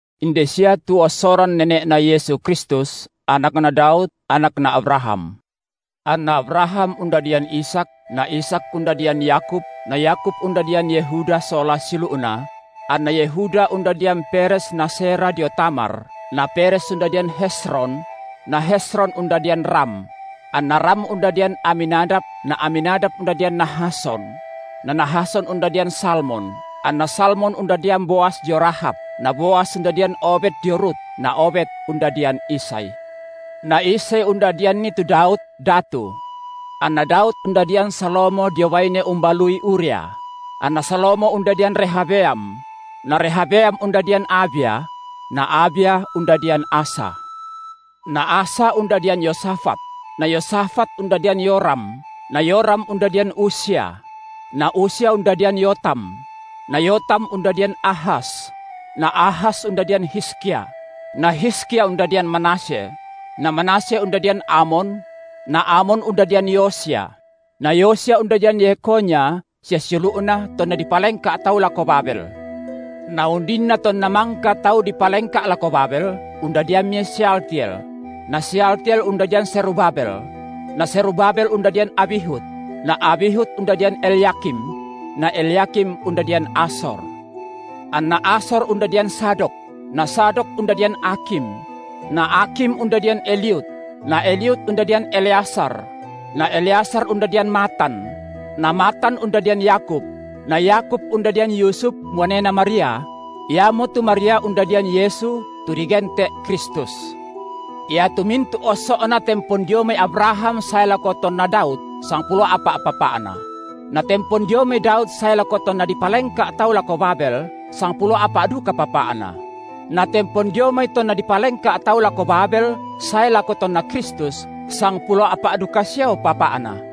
Inde sia tu ossoran nene’Na Yesu Kristus, anakna Daud, anakna Abraham. Anna Abraham undadian Ishak na Ishak undadian Yakub na Yakub undadian Yehuda sola siulu’na; anna Yehuda undadian Peres na Zerah dio Tamar; na Peres undadian Hezron; na Hezron undadian Ram; anna Ram undadian Aminadab na Aminadab undadian Nahason; na Nahason undadian Salmon; anna Salmon undadian Boas dio Rahab; na Boas undadian Obed dio Rut; na Obed undadian Isai. Na Isai undadianni tu Daud, datu. Anna Daud undadian Salomo dio baine umbalui Uria; anna Salomo undadian Rehabeam; na Rehabeam undadian Abia; na Abia undadian Asa; na Asa undadian Yosafat; na Yosafat undadian Yoram, na Yoram undadian Uzia; na Uzia undadian Yotam; na Yotam undadian Ahas; na Ahas undadian Hizkia; na Hizkia undadian Manasye; na Manasye undadian Amon; na Amon undadian Yosia; na Yosia undadian Yekhonya sia siulu’na tonna dipalengka’ tau lako Babel. Na undinna tonna mangka tau dipalengka’ lako Babel, undadiammi Sealtiel; na Sealtiel undadian Zerubabel; na Zerubabel undadian Abihud; na Abihud undadian Elyakim; na Elyakim undadian Azor; anna Azor undadian Zadok; na Zadok undadian Akhim; na Akhim undadian Eliud; na Eliud undadian Eleazar; na Eleazar undadian Matan; na Matan undadian Yakub; na Yakub undadian Yusuf, muanena Maria; iamotu Maria undadian Yesu, tu digente’ Kristus. Iatu mintu’ osso’na tempon dio mai Abraham sae lako tonna Daud, sangpulo a’pa’ papa’na; na tempon dio mai Daud sae lako tonna dipalengka’ tau lako Babel, sangpulo a’pa’ duka papa’na; na tempon dio mai tonna dipalengka’ tau lako Babel sae lako tonna Kristus, sangpulo a’pa’ duka siao papa’na.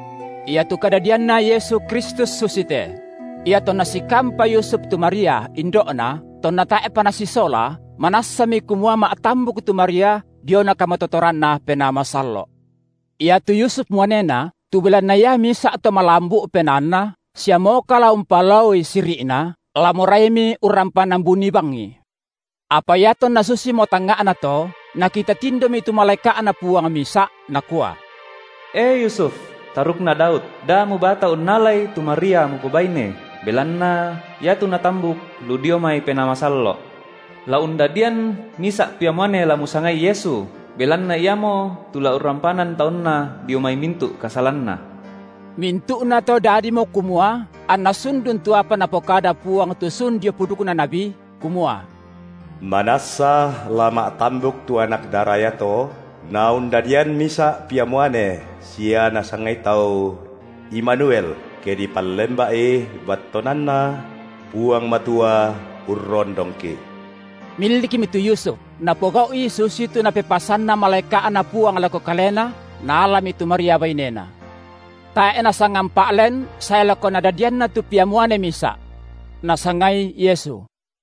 Iatu kadadianNa Yesu Kristus susite: Iatonna sikampa Yusuf tu Maria, indo’Na, tonna tae’pa nasisola, manassami kumua ma’tambuk tu Maria diona kamatotoranNa Penaa Masallo’. Iatu Yusuf muanena, tu belanna ia misa’ to malambu’ penaanna, sia moka la umpalaoi siri’na, la moraimi urrampanan buni bangi. Apa iatonna susimo tangnga’na to, nakita tindomi tu malaeka’Na Puang misa’, nakua: E Yusuf, tarukna Daud, da mubata unnalai tu Maria mupobaine, belanna iatu natambuk lu dio mai Penaa Massallo’. La undadian misa’ pia muane la musangai Yesu, belanna Iamo, tu la urrampanan taunNa dio mai mintu’ kasalanna. Mintu’nato dadimo kumua anna sundun tu apa Napokada Puang tu sun dio pudukna nabi, kumua: Manassa la ma’tambuk tu anak dara iato na undadian misa’ pia muane sia nasangai tau: Imanuel, ke dipallemba’i, battuananna: Puang Matua urrondongki’. Millikmi tu Yusuf, napogau’i susitu napepasananna malaeka’Na Puang lako kalena, naalami tu Maria bainena. Tae’ nasangampa’ len sae lako nadadianna tu pia muane misa’. Nasangai Yesu.